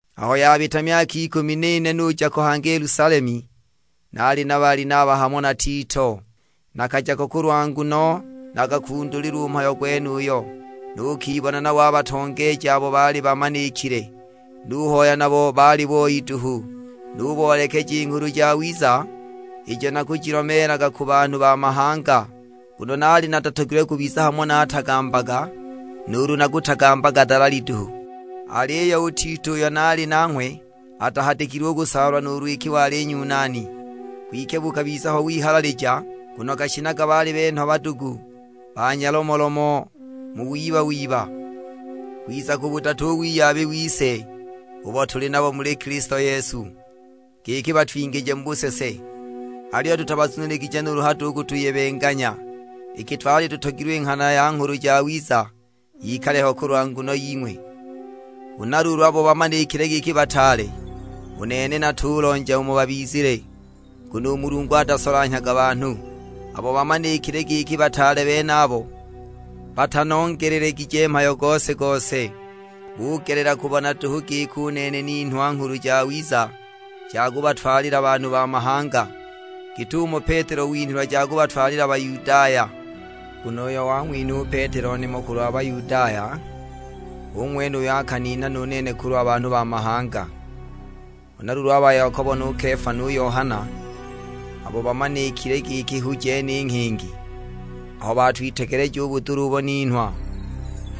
Aho yabita myaka ikumi n'ine nuja ko hangi i Yelusalemu, nali na Balinaba hamo na Tito. Nakaja ko kulwa nguno nakakundulilwa u mhayo gwenuyo, nukibona nabo a batongeeji abo baali bamanikile. Nuhoya nabo bali boi duhu. Nuboolekeja i Nghulu Jawiza ijo nakujilomeelaga ku banhu ba mahanga, nguno naali natatogilwe kubiza hamo naatagambaga, nuulu nakutagambaga dalali duhu. Aliyo u Tito uyo naali nanghwe atahadikilwe u kusaalwa nuulu iki wali Nyunani. Kwike bukabiza ho wihalalija, nguno gashinaga baali benhwa badugu ba nyalomolomo mu wiba-wiba, kwiza kubudata u wiyabi wise, ubo tuli nabo muli Kilisto Yesu, giki batwingije mu busese. Aliyo tutabazuniligije nuulu hado u kutuyebenganya, iki twali tutogilwe i nghana ya Nghulu Jawiza yikale ho kulwa nguno ying'we. Huna luulu abo bamanikile giki bataale (u nene natulonja umo babizile, nguno u Mulungu atasolanhyaga banhu), abo bamanikile giki bataale benabo, batanongelelegije mhayo gose-gose. Bugelela kubona duhu giki u nene ninhwa Nghulu Jawiza ja kubatwalila banhu ba mahanga, git'umo Petelo winhilwa ja kubatwalila Bayudaya. Nguno uyo wang'winha u Petelo nimo kulwa Bayudaya, hu ng'wene uyo akaninha nu nene kulwa banhu ba mahanga. Huna luulu a ba Yakobo nu Kefa nu Yohana, abo bamanikile giki hu jene i nghingi, aho bawitegeleja u budula ubo ninhwa,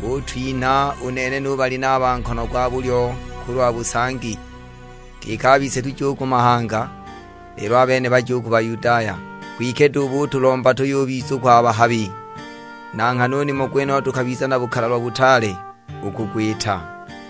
butwinha u nene nu Balinaba nkono gwa bulyo kulwa busangi, giki a bise tuje u ku mahanga, lelo a bene baje u ku Bayudaya. Kwike duhu butulomba tuyubizukwa a bahabi; na nghana u nimo gwenuyo tukabiza na bukalalwa butaale u kugwita.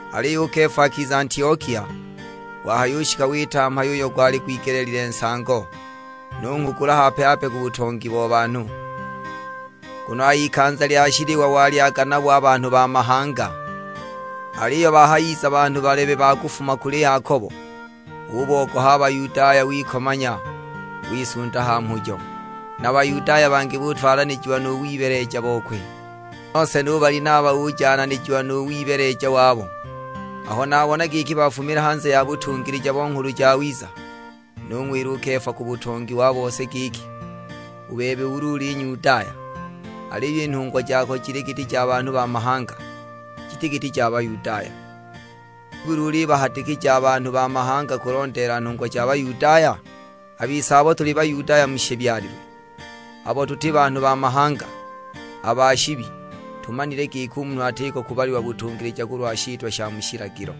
Aliyo u Kefa akiza Antiokia, wahayushika wita mhayo uyo gwali gwigeleelilwe nsango; nunghugula hape-hape ku butongi bo banhu. Nguno a h'ikanza lya shiliwa walyaga nabo a banhu ba mahanga, aliyo bahayiza banhu balebe ba kufuma kuli Yakobo, ubogoha a Bayudaya wikomanya, wisunda ha mhujo! Na Bayudaya bangi butwalanijiwa nu wibeeleja bokwe; nose nu Balinaba ujananijiwa u mu wibeeleja wabo! Aho nabona giki bafumila hanze ya butungilija bo Nghulu Jawiza, nung'wila u Kefa ku butongi wa bose; giki, "U bebe ulu uli Nyudaya, aliyo i nhungwa jako jili giti ja banhu ba mahanga, jiti giti ja Bayudaya, nibuli ulibahadikija a banhu ba mahanga kulondeela nhungwa ja Bayudaya?" A bise abo tuli Bayudaya mu shibyalilwe, abo tuti banhu ba mahanga, a ba shibi, tumanile giki u munhu atiko kubalilwa butungilija kulwa shitwa sha mu shilagilo,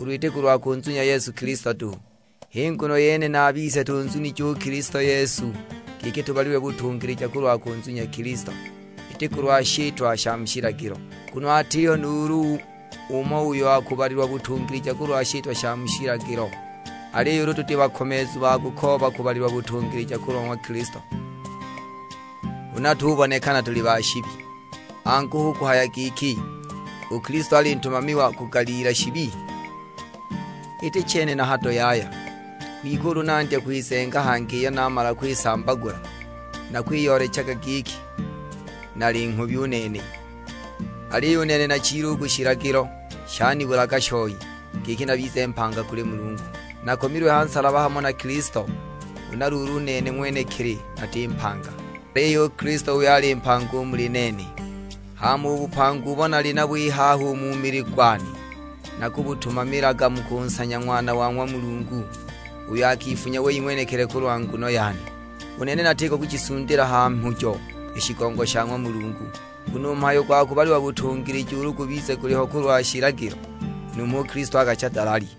ulu iti kulwa kunzunya Yesu Kilisto duhu. H'i nguno yene na a bise tunzunije u Kilisto Yesu, giki tubalilwe butungilija kulwa kunzunya Kilisto, iti kulwa shitwa sha mu shilagilo. Nguno atiho nuulu umo uyo akubalilwa butungilija kulwa shitwa sha mu shilagilo. Aliyo ulu tuli bakomeezu ba kukooba kubalilwa butungilija kulwa ng'wa Kilisto, huna tubonekana tuli ba shibi, angu, hu kuhaya giki u Kilisto ali ntumami wa kugaliila shibi? Iti chene na hado yaya! Kwike ulu nandya kwizenga hangi iyo naamala kwisambagula, nakwiyoolecha giki nali nghubi u nene! Aliyo u nene nachile u ku shilagilo; shanibulaga shoi, giki nabize mpanga kuli Mulungu. Nakomilwe ha nsalaba hamo na Kilisto; huna luulu u nene ng'wenekili nati mpanga, aliyo Kilisto h'uyo ali mpanga u muli nene. Hama u bupanga ubo nali nabo i haha u mu mili gwane, nakubutumamilaga mu kunsanya Ng'wana wa ng'wa Mulungu, uyo akifunya wei ng'wenekili kulwa nguno yane. U nene natiko kushisundila ha mhujo i shigongo sha ng'wa Mulungu, nguno u mhayo gwa kubalilwa butungilija ulu gubize guliho kulwa shilagilo, numho u Kilisto akacha dalali!